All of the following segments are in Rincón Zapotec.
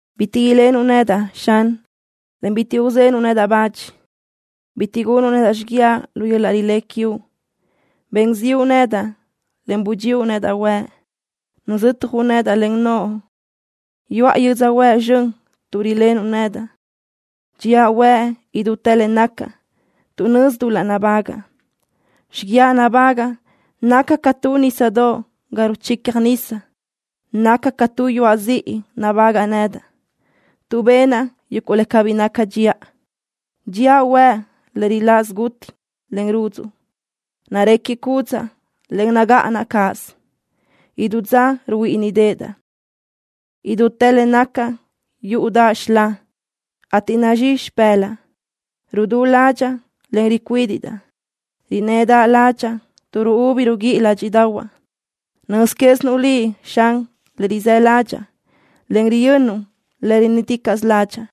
Bitiʼ ilenuʼ nedaʼ, Xan, en bitiʼ uzenuʼ nedaʼ bach. Bitiʼ gunuʼ nedaʼ xiguiaʼ lu yöl-laʼ rilé quiuʼ. Ben ziʼu nedaʼ, en budxíuʼ nedaʼ huëʼ. Nuzötjuʼ nedaʼ len noʼo. Yuʼa yödzöhuë́ʼ zxön tuʼ rilenuʼ nedaʼ. Dxía huëʼ idútë le nacaʼ tuʼ nözi dul-laʼ nabágaʼa. Xiguiaʼ nabágaʼa naca ca tu nísadoʼ ga ruchicjaʼ nisa. Naca ca tu yuaʼ ziʼi nabágaʼa nedaʼ. Tuʼ benaʼ yuguʼ le cabí naca dxiʼa, dxíaʼ huëʼ le riláʼ siguti, en rudzuʼ. Narecjiʼ cúdzaʼa, en nagáʼanaʼ cáʼasö. Idú dza ruhuíʼinideʼedaʼ. Idútë le nacaʼ yúʼudaʼa xilá, ateʼ nazxí xipë́laʼa. Rudú ládxaʼa, en ricuídiʼdaʼ. Rinnëdaʼ ládxaʼa tuʼ ruúbi ruguíʼi ládxiʼdaʼahuaʼ. Nöz quézinuʼ Liʼ, Xan, le rizë́ ládxaʼa, en riyönnuʼ le rinnë́ticaʼsö ládxaʼa.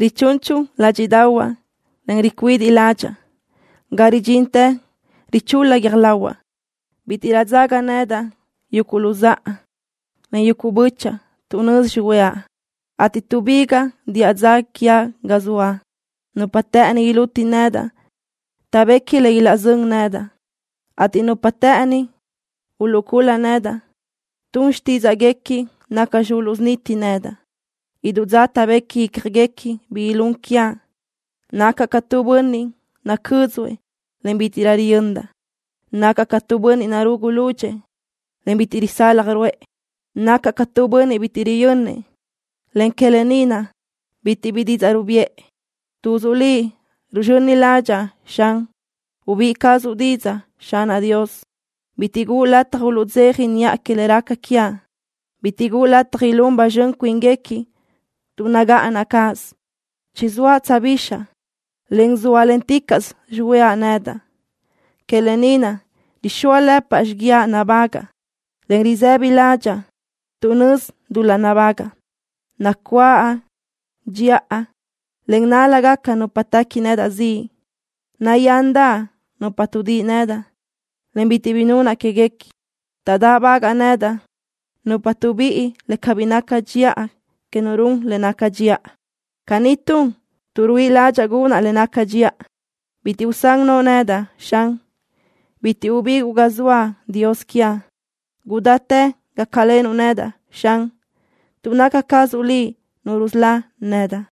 Richunchu ládxiʼdaʼahuaʼ, en ricuidiʼ ládxaʼa, ga ridxintë richul-la guiö́j lahuaʼ. Bítiʼrö taʼdzaga nedaʼ yuguʼ luzáʼa, en yuguʼ bö́chaʼa, tuʼ nözi xihuëʼa, ateʼ tuʼbigaʼ diʼa dza quiaʼ ga zoaʼ. Nupa të́ʼëni iluti nedaʼ taʼbequi le ilaʼzö́n nedaʼ, ateʼ nupa të́ʼëni uluʼcul-la nedaʼ tun xtídzaʼguequi nacxi uluʼsuniti nedaʼ. Idú dza taʼbequi ícjaguequi bi ilún quiaʼ. Nacaʼ ca tu bönniʼ nacö́dzuëʼ, en bítiʼrö riyöndaʼ. Nacaʼ ca tu bönniʼ narugu lúdxëʼë, en bitiʼ risaljëʼ ruʼë. Nacaʼ ca tu bönniʼ bítiʼrö riyönnëʼ, en que lë ni naʼ bitiʼ bi didzaʼ rubiʼë. Tuzuʼ Liʼ ruzxöni ládxaʼa, Xan. Ubíʼi cazuʼ didzaʼ, Xanaʼ Dios. Bitiʼ guʼu lataj uluʼdzeja niʼa que le raca quiaʼ. Bitiʼ guʼu lataj ilún ba zxön cuínguequi tuʼ nagáʼanaʼ cáʼasö. Chizóaʼ tsöjbixaʼ, en zóalenticaʼsö xihuëʼa nedaʼ. Que lë ni naʼ rixóalëpaʼ xiguiaʼ nabágaʼa, en risë́bidaʼ ládxaʼa tuʼ nözi dul-laʼ nabágaʼa. Nacuáʼ dxiʼa, en nál-lagaca nupa téqui nedaʼ ziʼ. Nayándaʼ nupa tuʼdíʼi nedaʼ, en bitiʼ bi nunaʼ quéguequi. Taʼdáʼbagaʼ nedaʼ nupa tuʼbíʼi le cabí naca dxiʼa que nu run le naca dxiʼa. Caní tun tuʼ ruíʼi ládxaʼa gunaʼ le naca dxiʼa. Bitiʼ usán noʼo nedaʼ, Xan. Bitiʼ ubiguʼ ga zoaʼ, Dios quiaʼ. Gudáchi gácalenuʼ nedaʼ, Xan, tuʼ naca cazuʼ Liʼ Nu rusölá nedaʼ.